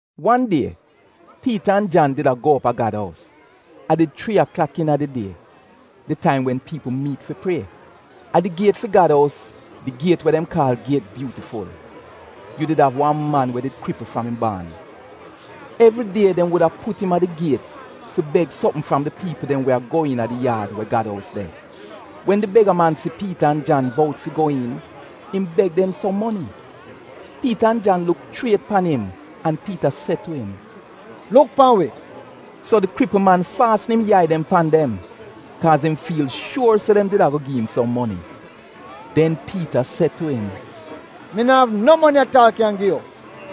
Wan die Piita an Jan did a go op a Gad ous. A did chrii aklak iina di die, di taim wen piipl miit fi prie. A di giet fi Gad ous, di giet we dem kaal Giet Byuutiful, yu did av wan man we did kripl fram im baan. Evridie dem wuda put im a di giet fi beg sopm fram di piipl dem we a go iina di yaad we Gad ous de. Wen di bega-man si Piita an Jan bout fi go iin, im beg dem som moni. Piita an Jan luk chriet pan im an Piita se tu im, “Luk pan wi!” So di kripl man faasn im yai dem pan dem kaaz im fiil shuor se dem did a go gi im som moni. Den Piita se tu im, “Mi no av no moni at aal kyan gi yu.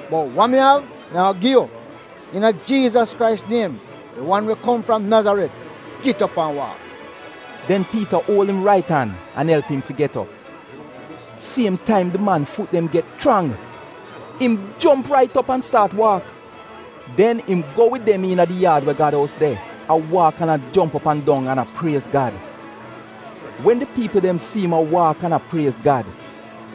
Bot wa mi av mi a-go gi yu. Iina Jiizas Krais niem, di wan we kom fram Nazaret, git op an waak.” Den Piita uol im rait an an elp im fi get op. Siem taim di man fut dem get chrang. Im jomp rait op an staat waak. Den im go wid dem iina di yaad we Gad ous de, a waak, an a jomp op an dong an a priez Gad. Wen di piipl dem si im a waak an a priez Gad,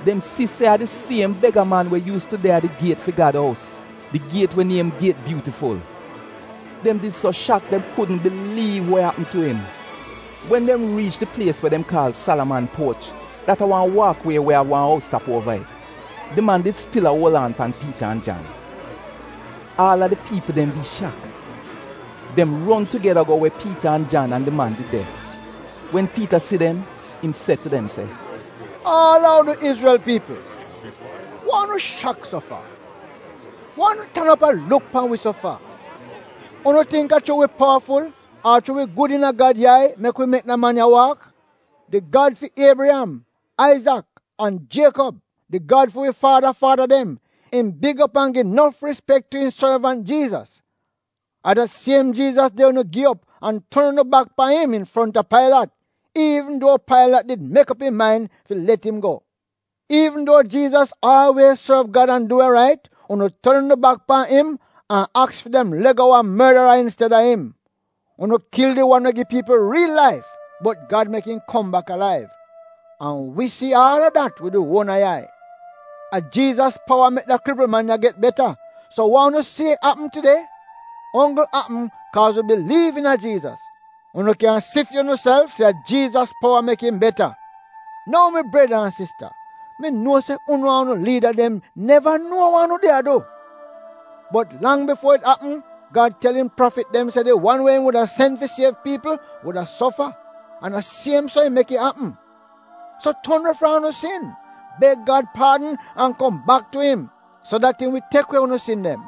dem si se a di siem bega-man we yuus tu de a di giet fi Gad ous, di giet we niem Giet Byuutiful. Dem did so shak dem kudn biliiv we apm tu im. Wen dem riich di plies we dem kaal Salaman Puoch, dat a wan waak wie we av wan ous tap uova it, di man did stil a uol aan pan Piita an Jan. Aal a di piipl dem did shak. Dem ron tugeda go we Piita an Jan an di man did de. Wen Piita si dem, im se tu dem se, “Aal a unu Izrel piipl, wa unu shak so fa? Wa unu tan op a luk pan wi so fa? Unu tingk a chuu wi powaful ar chuu wi gud iina Gad yai mek wi mek da man ya waak? Di Gad fi Iebriyam, Aizak, an Jiekob, di Gad fi wi faada faada dem, im big op an gi nof rispek tu im sorvant Jiizas. A da siem Jiizas de unu gi op, an ton unu bak pan im infronta Pailat, iivn duo Pailat did mek op im main fi let im go. Iivn duo Jiizas aalwiez sorv Gad an du we rait, unu ton unu bak pan im an aks fi dem le'go wan mordara insted-a im. Unu kil di wan we gi piipl riil laif, bot Gad mek im kom bak alaiv. An wi si aal a dat wid wi uona yai. A Jiizas powa mek da kripl man ya get beta. So wa unu si apm tide, onggl apm kaaz wi biliiv iina Jiizas. Unu kyan si fi unuself se a Jiizas powa mek im beta. “Nou mi breda an sista, mi nuo se unu an unu liida dem neva nuo wa unu did a du. Bot lang bifuo it apm, Gad tel im prafit dem se di wan we im wuda sen fi siev piipl wuda sofa, an a siem so im mek it apm. So ton we fram unu sin, beg Gad paadn an kom bak tu im, so dat im wi tek we unu sin dem.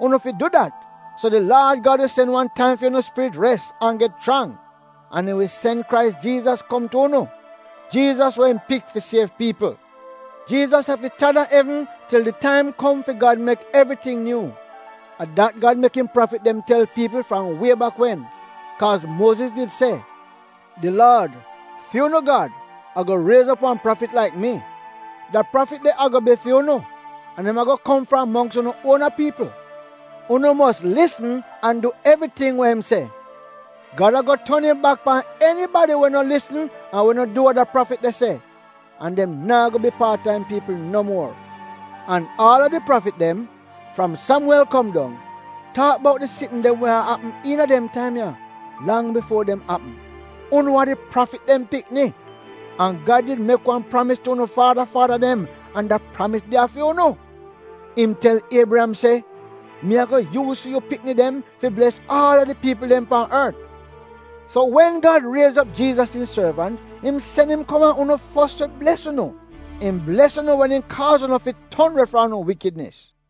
Unu fi du dat so di Laad Gad wi sen wan taim fi unu spirit res an get chrang, an im wi sen Krais Jiizas kom tu unu, Jiizas we im pik fi siev piipl. Jiizas afi tan a evn til di taim kom fi Gad mek evriting nyuu. A dat Gad mek im prafit dem tel piipl fram wie bak wen. Kaaz Muoziz did se, ‘Di Laad, fu'unu Gad, a-go riez op wan prafit laik mi. Da prafit de a-go bi fu'unu, an im a-go kom fram mongks unu uona piipl. Unu mos lisn an du evriting we im se. Gad a-go ton im bak pan enibadi we no lisn an we no du we da prafit de se, an dem naa go bi paat a im piipl no muor.’ “An aal a di prafit dem, fram Samwel kom dong, taak bout di sitn dem we a apm iina dem taim ya lang bifuo dem apm. Unu a di prafit dem pikni, an Gad did mek wan pramis tu unu faada faada dem an da pramis de a fi unu. Im tel Iebriyam se, ‘Mi a-go yuuz fi yu pikni dem fi bles aal a di piipl dem pan ort.’ So wen Gad riez op Jiizas im sorvant, im sen im kom a unu fos fi bles unu. Im bles unu wen im kaaz unu fi ton we fram unu wikidnis.”